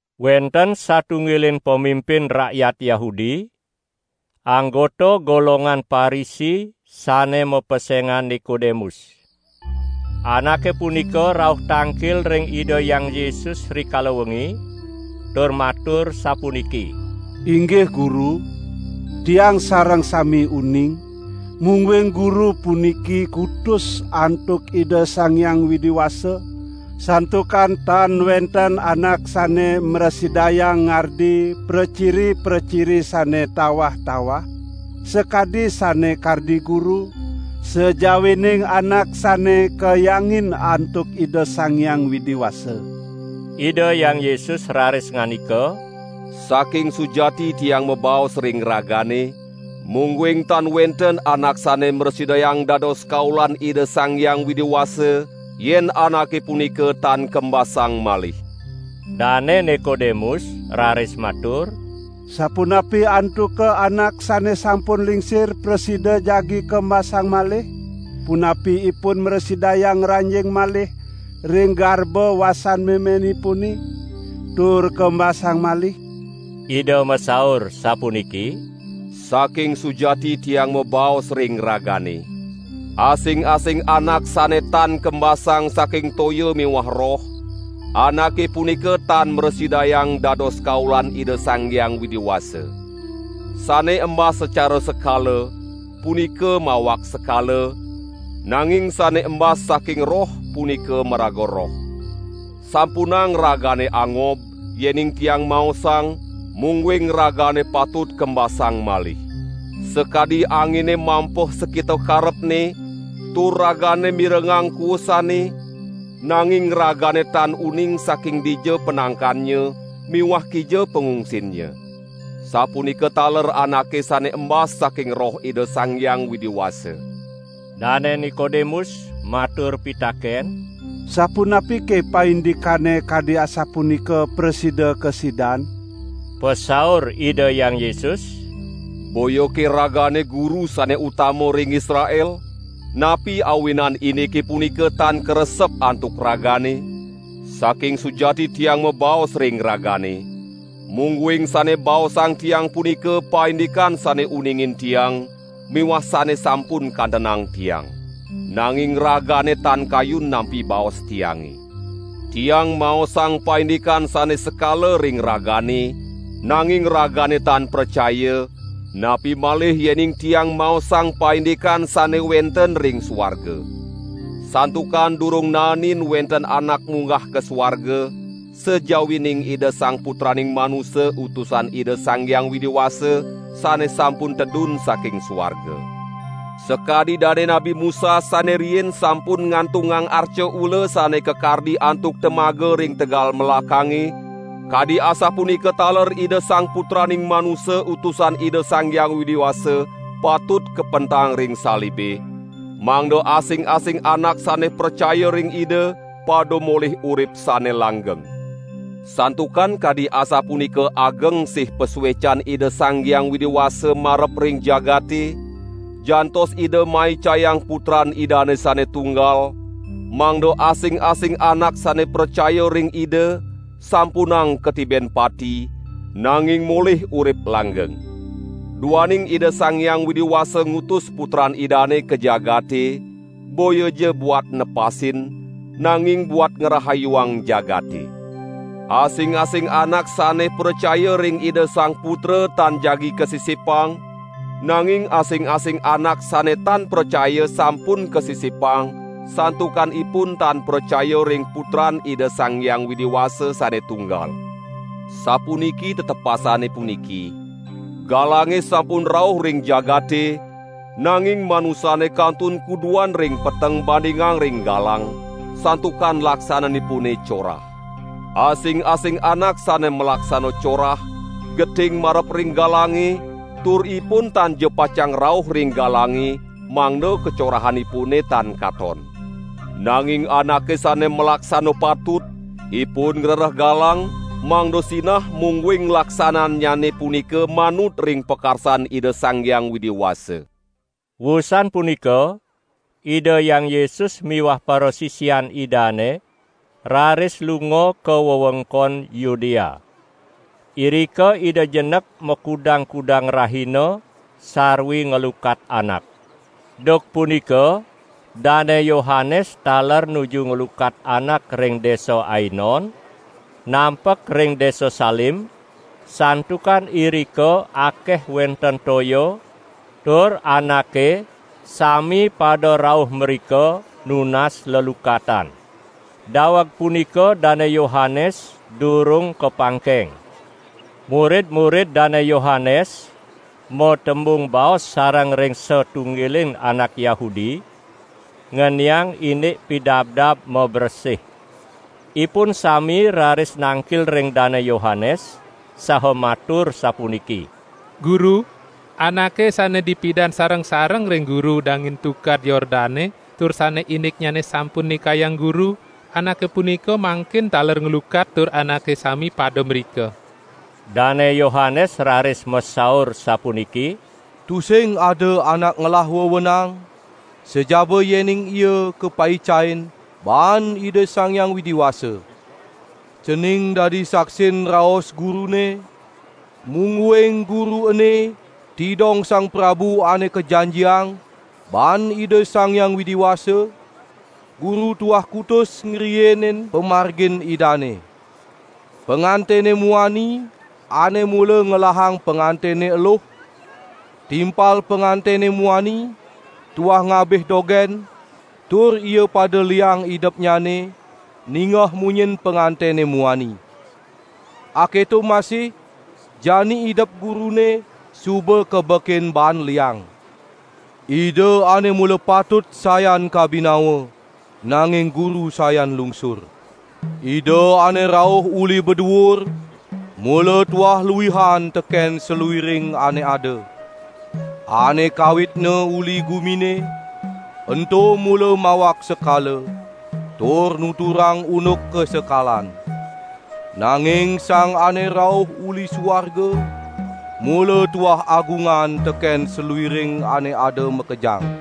Wenten satunggiling pamimpin rakyat Yahudi, anggota golongan Parisi sane mapesengan Nikodemus. Anake punika rauh tangkil ring Ida Hyang Yesus rikala wengi tur matur sapuniki: "Inggih Guru, tiang sareng sami uning, mungguing Guru puniki kutus antuk Ida Sang Hyang Widi Wasa, santukan tan wenten anak sane mrasidayang ngardi praciri-praciri sane tawah-tawah, sakadi sane kardi Guru, sajawining anak sane kahyangin antuk Ida Sang Hyang Widi Wasa." Ida Hyang Yesus raris ngandika: "Saking sujati Tiang mabaos ring ragane: Mungguing tan wenten anak sane mrasidayang dados kaulan Ida Sang Hyang Widi Wasa, yen anake punika tan kembasang malih." Dane Nikodemus raris matur: "Sapunapi antuka anak sane sampun lingsir prasida jagi kembasang malih? Punapi ipun mrasidayang ngranjing malih ring garba wasan memenipune, tur kembasang malih?" Ida masaur sapuniki: "Saking sujati Tiang mabaos ring ragane: Asing-asing anak sane tan kembasang saking toya miwah Roh, anake punika tan mrasidayang dados kaulan Ida Sang Hyang Widi Wasa. Sane embas sacara sekala, punika mawak sekala, nanging sane embas saking Roh punika maraga roh. Sampunang ragane angob, yening Tiang maosang, mungguing ragane patut kembasang malih. Sakadi angine mampeh sakita karepne, tur ragane mirengang kuusane, nanging ragane tan uning saking dija panangkannya miwah kija pangungsinnya. Sapunika taler anake sane embas saking Roh Ida Sang Hyang Widi Wasa." Dane Nikodemus matur pitaken: "Sapunapike paindikane kadi asapunika prasida kasidan?" Pasaur Ida Hyang Yesus: "Boyake ragane guru sane utama ring Israel? Napi awinan indike punika tan karesep antuk ragane? Saking sujati Tiang mabaos ring ragane, mungguing sane baosang Tiang punika paindikan sane uningin Tiang miwah sane sampun kantenang Tiang. Nanging ragane tan kayun nampi baos Tiange. Tiang maosang paindikan sane sekala ring ragane, nanging ragane tan pracaya, napi malih yening Tiang maosang paindikan sane wenten ring suarga. Santukan durung naenin wenten anak munggah ka suarga, sajawining Ida Sang Putraning Manusa Utusan Ida Sang Hyang Widi Wasa, sane sampun tedun saking suarga." Sakadi Dane Nabi Musa sane riin sampun ngantungang arca ula sane kakardi antuk temaga ring tegal melakange, kadi asapunika taler Ida Sang Putraning Manusa Utusan Ida Sang Hyang Widi Wasa, patut kapentang ring salibe, mangda asing-asing anak sane pracaya ring Ida, pada molih urip sane langgeng. Santukan kadi asapunika ageng sih pasuecan Ida Sang Hyang Widi Wasa marep ring jagate, jantos Ida maicayang Putran Idane sane tunggal, mangda asing-asing anak sane pracaya ring Ida, sampunang katiben pati, nanging molih urip langgeng. Duaning Ida Sang Hyang Widi Wasa ngutus Putran Idane ka jagate, boyaja buat nepasin, nanging buat ngrahayuang jagate. Asing-asing anak sane pracaya ring Ida Sang Putra tan jagi kasisipang, nanging asing-asing anak sane tan pracaya sampun kasisipang, santukan ipun tan pracaya ring Putran Ida Sang Hyang Widi Wasa sane tunggal. Sapuniki tetepasane puniki: Galange sampun rauh ring jagate, nanging manusane kantun kuduan ring peteng bandingang ring galang, santukan laksananipune corah. Asing-asing anak sane malaksana corah, geting marep ring galange tur ipun tanja pacang rauh ring galange mangda kacorahanipune tan katon. Nanging anake sane malaksana patut, ipun ngrereh galang mangda sinah mungguing laksanannyane punika manut ring pakarsan Ida Sang Hyang Widi Wasa. Wusan punika, Ida Hyang Yesus miwah parasisian Idane raris lunga ka wewengkon Yudea. Irika Ida jenek makudang-kudang rahina sarwi nglukat anak. Duk punika Dane Yohanes taler nuju nglukat anak ring desa Ainon, nampek ring desa Salim, santukan irika akeh wenten toya tur anake sami pada rauh mrika nunas lelukatan. ( Daweg punika Dane Yohanes durung kapangkeng.) Murid-murid Dane Yohanes matembung baos sareng ring satunggiling anak Yahudi ngeniang indik pidabdab mabresih. Ipun sami raris nangkil ring Dane Yohanes saha matur sapuniki: "Guru, Anake sane dipidan sareng-sareng ring guru dangin Tukad Yordane tur sane indikNyane sampun nikayang guru, Anake punika mangkin taler nglukat tur anake sami pada mrika!" Dane Yohanes raris masaur sapuniki: "Tusing ada anak ngelah wewenang, sajaba yening ia kapaicain baan Ida Sang Hyang Widi Wasa. Cening dadi saksin raos gurune; mungguing guru ene tidong Sang Prabu Ane Kajanjiang baan Ida Sang Hyang Widi Wasa, guru tuah kutus ngriinin pamargin Idane. Pangantene muani ane mula ngelahang pangantene eluh, timpal pangantene muani tuah ngabih dogen tur ia pada liang idepnyane ningeh munyin pangantene muani. Aketo masih jani idep gurune suba kabekin baan liang. Ida ane mula patut sayan kabinawa, nanging guru sayan lungsur." Ida ane rauh uli baduur, mula tuah luihan teken saluiring ane ada. Ane kawitne uli gumine, ento mula mawak sekala, tur nuturang unduk kasekalan. Nanging Sang Ane Rauh uli suarga, mula tuah agungan teken saluiring ane ada makejang.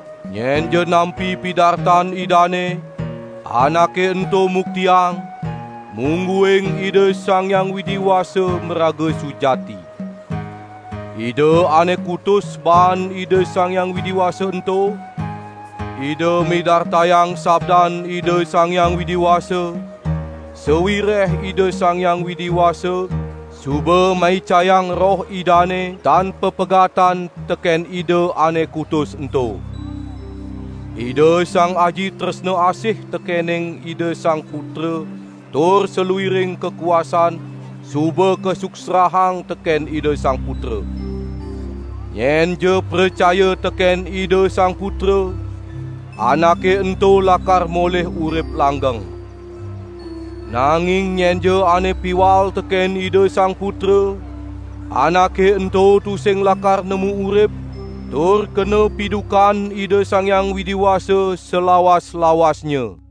Nyenja nampi pidartan Idane, anake ento muktiang, mungguing Ida Sang Hyang Widi Wasa maraga sujati. Ida ane kutus baan Ida Sang Hyang Widi Wasa ento, Ida midartayang sabdan Ida Sang Hyang Widi Wasa, sawireh Ida Sang Hyang Widi Wasa suba maicayang Roh Idane tan papegatan teken Ida ane kutus ento. Ida Sang Aji tresna asih tekening Ida Sang Putra tur saluiring kakuasan suba kasuksrahang teken Ida Sang Putra. Nyenja pracaya teken Ida Sang Putra, anake ento lakar molih urip langgeng. Nanging nyenja ane piwal teken Ida Sang Putra, anake ento tusing lakar nemu urip tur kena pidukan Ida Sang Hyang Widi Wasa salawas-lawasnya.